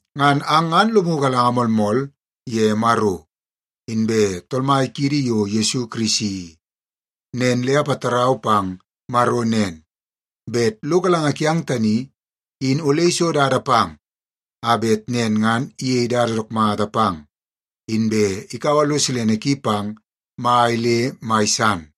Ngan ang ngan lomu galanga moolmool ye Maro inbe Tool Mai kiidi yo Yesu Kirisi i. Nen le apatarau pang Maro nen, bet lo galanga kiang tani in ole iso dada pang a bet nen ngan iyei dada dook mata pang, inbe ikaua lo silene ki pang mai le mai san.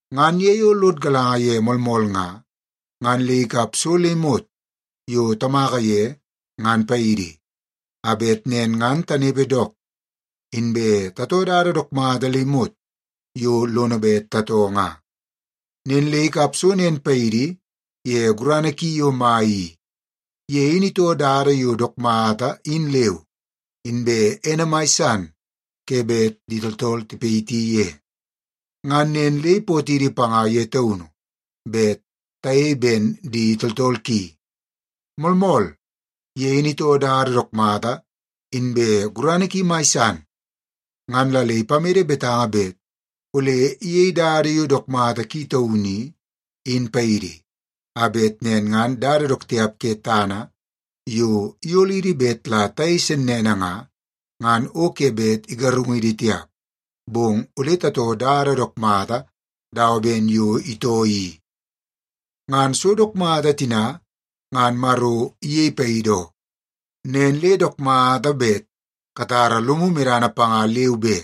Ngan ye yo lod galanga ye moolmool nga, ngan le ikap so le imot yo tamaka ye ngan paidi, a bet nen ngan tanepe dook, inbe tatoo dada dook mata le imot yo lono bet tatoo nga. Nen le ikap so nen paidi ye gurana ki yo mai i. Ye in itoo dada yo dook mata in leu, inbe ene mai san ke bet di tooltool tipayiti ye. Ngan nen le ipootidi panga ye taunu bet tayei ben di tooltool ki. Moolmool, ye in itoo dada dook mata inbe gurana ki mai san. Ngan la le ipamede betanga bet ole iyeie dada yo dook mata ki taunu i, in paidi, a bet nen ngan dada dook tiap ke tana yo iyolidi bet la tayei sennene nga, ngan o ke bet igarungidi tiap, bong ole tatoo dada dook mata dawa ben yo itoo i. Ngan so dook mata tina ngan Maro iyei paidi oo, nen le dook mata bet katara lomu medana panga leu be,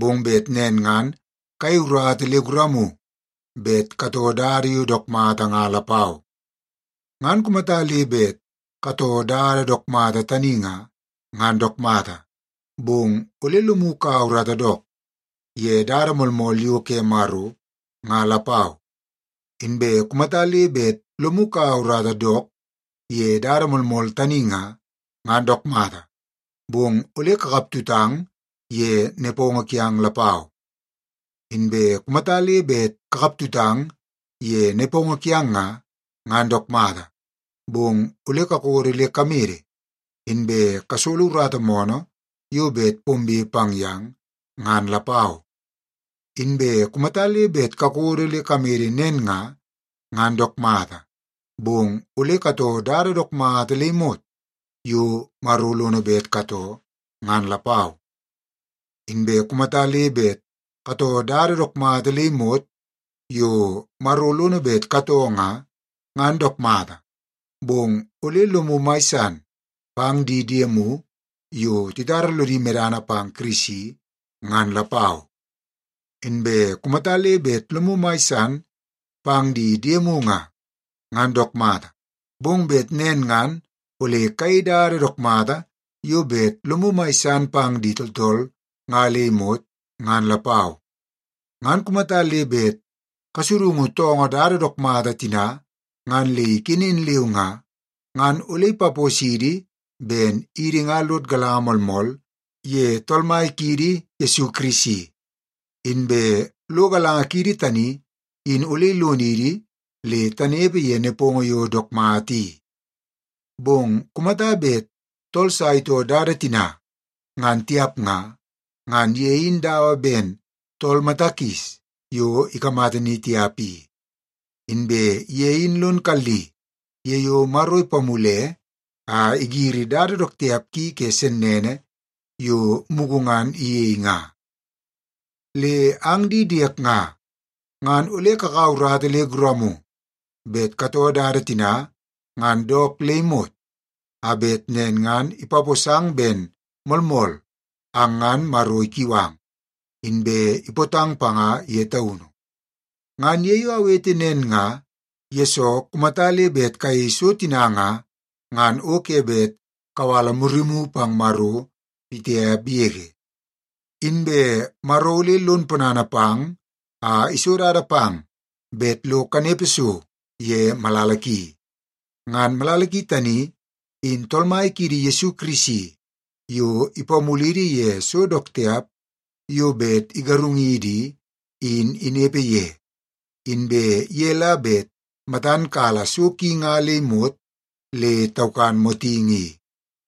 bong bet nen ngan kayei urata le guramu bet katoo dada yo dook mata nga lapau. Ngan kumata le bet katoo dada dook mata tani nga, ngan dook mata, bong ole lomu kaua urata dook ye dada moolmool yo ke Maro nga lapau. Inbe kumata le bet lomu kaua urata dook ye dada moolmool tani nga, ngan dook mata, bong ole kakap tutang ye nepongo kiang lapau. Inbe kumata le bet kakaptutang ye nepongo kiang nga, ngan dook mata, bong ole kakodo le kamede inbe kasolo urata moonoo yo bet pombe pang yang, ngan lapau. Inbe kumata le bet kakodo le kamede nen nga, ngan dook mata, bong ole katoo dada dook mata le imot yo Maro lono bet katoo ngan lapau. Inbe kumata le bet katoo dada dook mata le imot yo Maro lono bet katoo nga, ngan dook mata, bong ole lomu mai san pang di diemu yo titara lodi medana pang Kirisi ngan lapau. Inbe kumata le bet lomu mai san pang di diemu nga, ngan dook mata, bong bet nen ngan ole kayei dada dook mata yo bet lomu mai san pang di tooltool nga le imot ngan lapau. Ngan kumata le bet tasudungu toongoo dada dook mata tina ngan le ikenen leu nga, ngan ole ipaposidi ben idi nga lod galanga moolmool ye Tool Mai kiidi Yesu Kirisi, inbe lo galanga kiidi tani in ole ilonidi le tanepe ye nepongo yo dook mata i. Bong kumata bet tool sa itoo dada tina ngan tiap nga, ngan ye in dawa ben tool mata kis yo ikamata ni tiap i. Inbe ye in lon kalli ye yo Maro ipamule a igiri dada dook tiap ki ke sennene yo mugu ngan iyei nga. Le ang di diek nga, ngan ole kakaua urata le guramu bet katoo dada tina nga dook le imot, a bet nen ngan ipaposang ben moolmool ang ngan Maro ikiu ang, inbe ipootang panga ye taunu. Ngan ye yo awete nen nga, yesoo kumata le bet kayei so tina nga, ngan o ke bet kawala murimu pang Maro pitiap yege. Inbe Maro ole lon ponana pang a iso dada pang bet lo kanepe so ye malala ki. Ngan malala ki tani, in Tool Mai kiidi Yesu Kirisi yo ipamulidi ye so dook tiap yo bet igarungidi i, in inepe ye. Inbe ye la bet matan kala so ki nga le imot le taukan motingi i.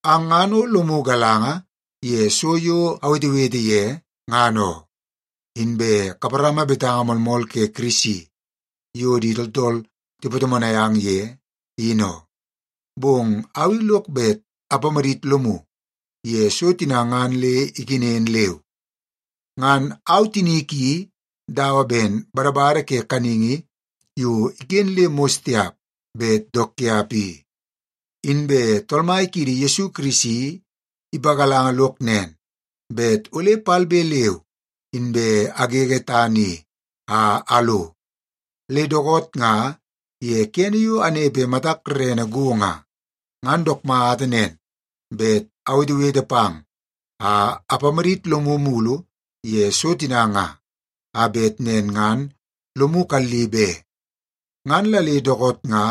Ang ngan o lomu galanga ye so yo awetewete ye, ngan oo. Inbe kaparama betanga moolmool ke Kirisi yo di tooltool tipatomonai ang ye, in oo. Bong au i lok bet apamadit lomu ye so tina ngan le ikenen leu. Ngan au tinik i dawa ben badabada ke kaningi yo iken le mos tiap bet dook tiap i. Inbe Tool Mai kiidi Yesu Kirisi ipagalanga lok nen, bet ole palbe leu inbe agege tana i a alo. Le dookoot nga ye kene yo anepe matak rerene go nga, ngan dook mata nen bet awetewete pang a apamadit lomu mulu ye so tina nga, a bet nen ngan lomu kalli be. Ngan la le dookoot nga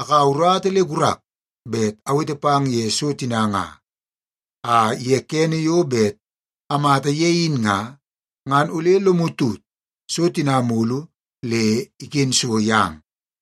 akaua urata le gurak bet awete pang ye so tina nga, a ye kene yo bet amata ye in nga, ngan ole lomu tut so tina mulu le iken so yang.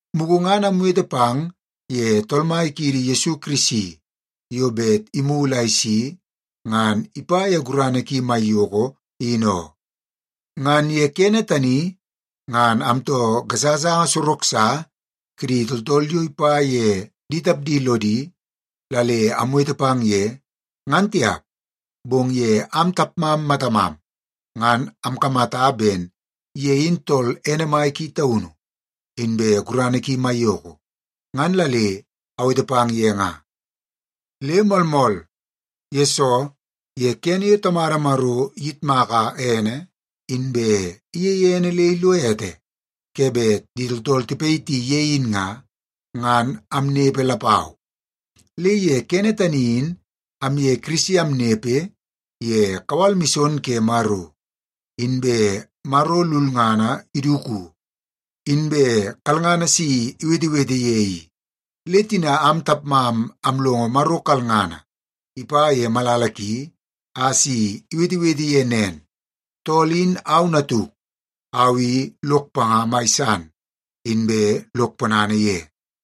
Mugu ngan amwete pang ye Tool Mai kiidi Yesu Kirisi yo bet imulu a isi ngan ipa ye gurana ki maiyoko in oo. Ngan ye kene tani ngan amtoo gasagasanga sorok sa kidi tooltool yo ipa ye di tapdi lodi la le amwete pang ye, ngan tiap. Bong ye am tapmam matamam, ngan amkamata ben ye in tool ene mai ki taunu, inbe gurana ki maiyoko, ngan la le awete pang ye nga. Le moolmool, yesoo ye kene yo Tamada Maro iyitmaka ene inbe iyeie ene le ilo ete ke bet di tooltool tipayiti ye in nga, ngan amnepe lapau. Le ye kene tani in amye Kirisi amnepe ye kawal mison ke Maro, inbe Maro lulngana iduku, inbe kalngana si iwetewete ye i. Le tina am tapmam amlongo Maro kalngana ipa ye malala ki a si iwetewete ye nen, “Tool in au Natuk. Au i lok panga mai san, inbe lok ponana ye.”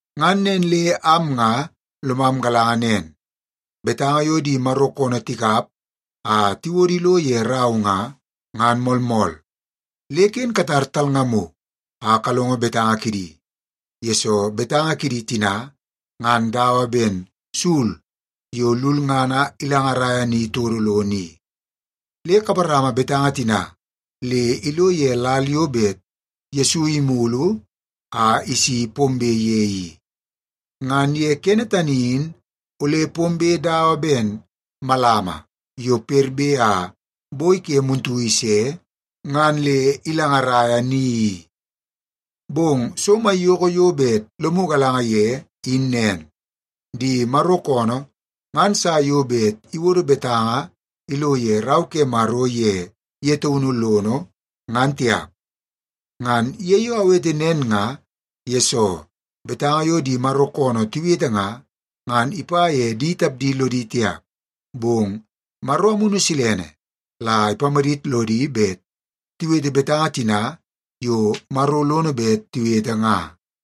Ngan nen le am nga lomam galanga nen, betanga yo di Maro koonoo tikap a tiwodo ilo ye rau nga, ngan moolmool. Le ken katar talngamu a kalongo betanga kidi, yesoo betanga kidi tina ngan dawa ben sul yo lulngana ilangaraia ni todo lono i. Le kaparama betanga tina le ilo ye lal yo bet Yesu imulu a isi pombe ye i. Ngan ye kene tani in ole pombe dawa ben malama yo perbe a boi ke muntu ise ngan le ilangaraia ni i. Bong so maiyoko yo bet lomu galanga ye in nen: Di Maro koonoo ngan sa yo bet iwodo betanga ilo ye Rau ke Maro ye ye taunu lono, ngan tiap. Ngan ye yo awete nen nga, yesoo betanga yo di Maro koonoo tiwete nga, ngan ipa ye di tapdi lodi tiap, bong Maro Amunu Silene la ipamadit lodi bet tiwete betanga tina yo Maro lono bet tiwete nga.